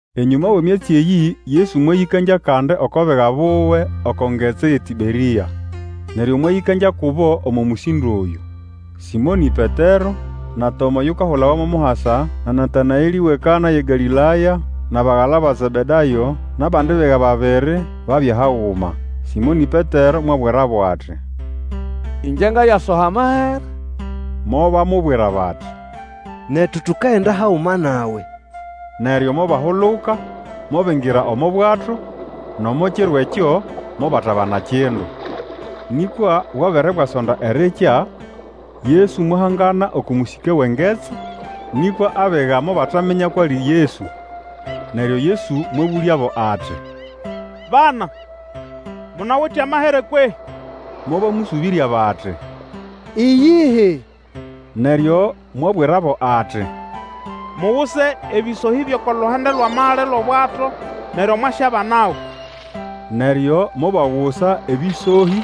Enyũma wʼemyatsi eyĩ, Yesu mwayĩkangya kandi oko biga buwe oko ngetsi yʼeTĩberĩa. Neryo mwayĩkangya kubo omo mũsĩndo oyũ. Sĩmonĩ Petero, na Toma oyukahulawa mo Muhasa, na Natanaelĩ wʼeKana yʼeGalĩlaya, nʼabagala ba Zebedayo, nʼabandi biga babiri, babya haguma. Sĩmonĩ Petero mwabwirabo ati, Ĩngye ngayasoha amahere. Mobamubwira bati, Netu tukagenda haguma nawe. Neryo mobahuluka mobingira omo bwato, nʼomo kiro ekyo mobatabana kindu. Nĩkwa bwabere bwasonda erikya, Yesu mwahangana oko mũsĩke wʼengetsi, nĩkwa abiga mobataminya kwʼali Yesu. Neryo Yesu mwabũlyabo ati, Bana, munawite amahere kwehĩ? Mobamũsũbĩrya bati, Iyihi. Neryo mwabwirabo ati, Muguse ebĩsohĩ byʼoko luhande lwʼamali lwʼobwato neryo mwasyabanago. Neryo mobagusa ebĩsohĩ,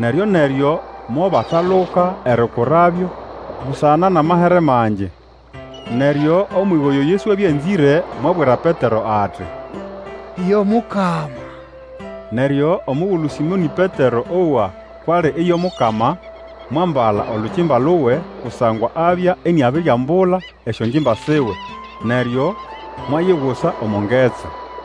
neryo-neryo mobataluka erikurabyo busana nʼamahere mangi. Neryo omwiga oyo Yesu abya anzĩre mwabwira Petero ati, Yo Mukama! Neryo omugulu Sĩmonĩ Petero owa kwʼali iyo Mukama, mwambala olukimba luwe, kusangwa abya iniabiriambula esyongimba siwe, neryo mwayigusa omo ngetsi.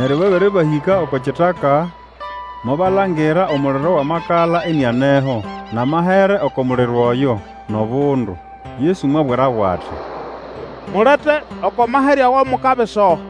Neryo babere bahĩka oko kitaka, mobalangira omuliro wʼamakala inianeho, nʼamahere oko muliro oyo, nʼobundu. Yesu mwabwirabo ati, Mulete oko mahere ago mukabisoha.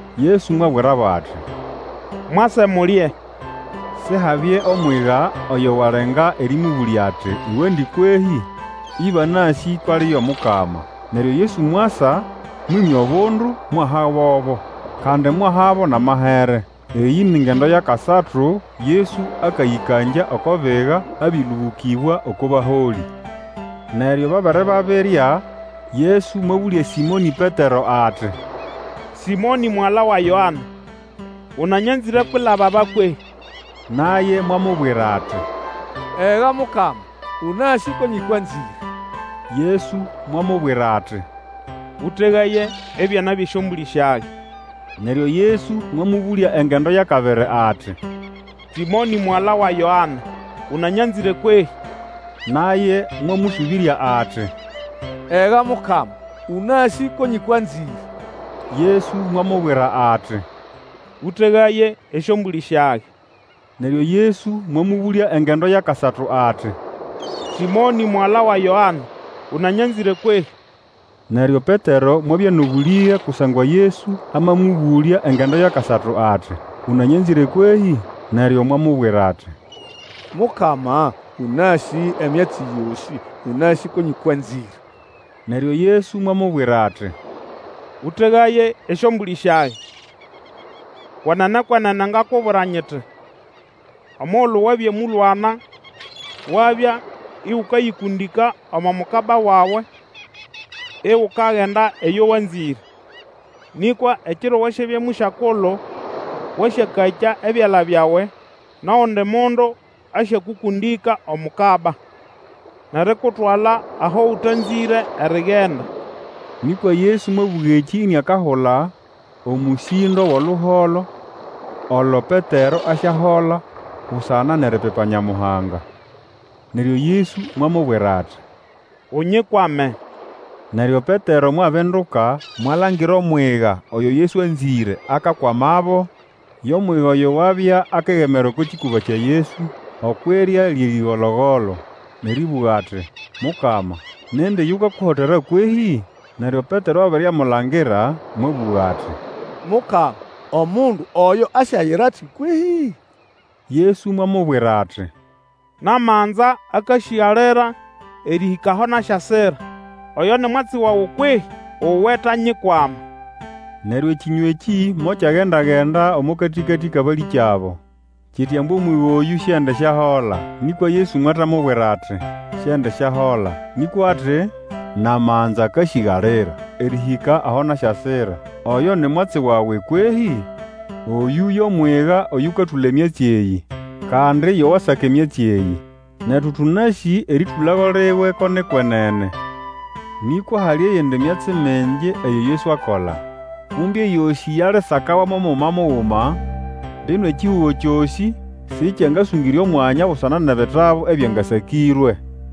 Yesu mwabwirabo ati, Mwase mulye. Sihabye omwiga oyo walenga erĩmũbũlya ati, Uwendi kwehĩ? Ĩbanasĩ kwʼali iyo Mukama. Neryo Yesu mwasa, mwĩmya obundu, mwahabobo. Kandi mwahabo nʼamahere. Eyĩ ni ngendo yʼakasatu Yesu akayĩkangya oko biga; abĩlũbũkĩbwa oko baholĩ. Neryo babere babirya, Yesu mwabũlya Sĩmonĩ Petero ati, Sĩmonĩ, mugala wa Yoane, ũnanyanzĩre kwilaba aba kwehĩ? Naye mwamubwira ati, Ega, Mukama! Ũnasĩ ko nyĩkwanzĩre. Yesu mwamubwira ati, Ũtegaye ebyana byʼesyombũlĩ syage. Neryo Yesu mwamũbũlya engendo yʼakabiri ati, Sĩmonĩ, mugala wa Yoane, ũnanyanzĩre kwehĩ? Naye mwamũsũbĩrya ati, Ega, Mukama, ũnasĩ ko nyĩkwanzĩre. Yesu mwamubwira ati, Ũtegaye esyombũlĩ syage. Neryo Yesu mwamũbũlya engendo yʼakasatu ati, Sĩmonĩ, mugala wa Yoane, ũnanyanzĩre kwehĩ? Neryo Petero mwabya nʼobũlĩge kusangwa Yesu amamũbũlya engendo yʼakasatu ati, Ũnanyanzĩre kwehĩ? Neryo mwamubwira ati, Mukama, ũnasĩ emyatsi yosĩ, ũnasĩ ko nyĩkwanzĩre! Neryo Yesu mwamubwira ati, Ũtegaye esyombũlĩ syage. Kwenene, kwenene ngakubwira nyiti, omugulu wabya mũlwana, wabya igukayĩkũndĩka omo mukaba wawe, igukagenda eyo wanzĩre; nĩkwa ekiro wasyabya mũsyakulu, wasyakakya ebyala byawe, nʼogundi mundu asyakũkũndĩka omukaba, nʼerikutwala aho ũtanzĩre erigenda. Nĩkwa Yesu mwabũga ekĩ iniakahula omũsĩndo wʼoluholo olo Petero asyahola busana nʼeripipa Nyamuhanga. Neryo Yesu mwamubwira ati, Unyikwame! Neryo Petero mwabinduka, mwalangira omwiga oyo Yesu anzĩre akakwamabo, yo mwiga oyo wabya akegemera oko kĩkũba kya Yesu okwʼirya lyʼerĩgolo-golo, nʼerĩbũga ati, Mukama, nindi yukakuhotera kwehĩ? Neryo Petero abere amulangira, mwabũga ati, Mukama, omundu oyo asyayira ati kwehĩ? Yesu mwamubwira ati, Namanza akasĩgalira erĩhĩka aho nasyasira, oyo ni mwatsi wawe kwehĩ? Uwe tanyikwama! Neryo ekĩnywa ekĩ mokyagenda-genda omo katĩkatĩ kʼabalĩkyabo, kiti ambu omwiga oyũ Siendisyahola. Nĩkwa Yesu mwatamubwira ati, Siendisyahola; nĩkwa ati, Namanza akasĩgalira erĩhĩka aho nasyasira, oyo ni mwatsi wawe kwehĩ? Oyũ yo mwiga oyũkatũla emyatsi eyĩ, kandi yo wasaka emyatsi eyĩ, netu tũnasĩ erĩtũlago liwe ko ni kwenene. Nĩkwa hali eyindi myatsi mingi eyo Yesu akola. Kumbe eyosĩ yalisakawa mo muguma muguma, mbino ekihugo kyosĩ sĩkyangasũngĩre omwanya busana nʼebitabu ebyangasakĩrwe.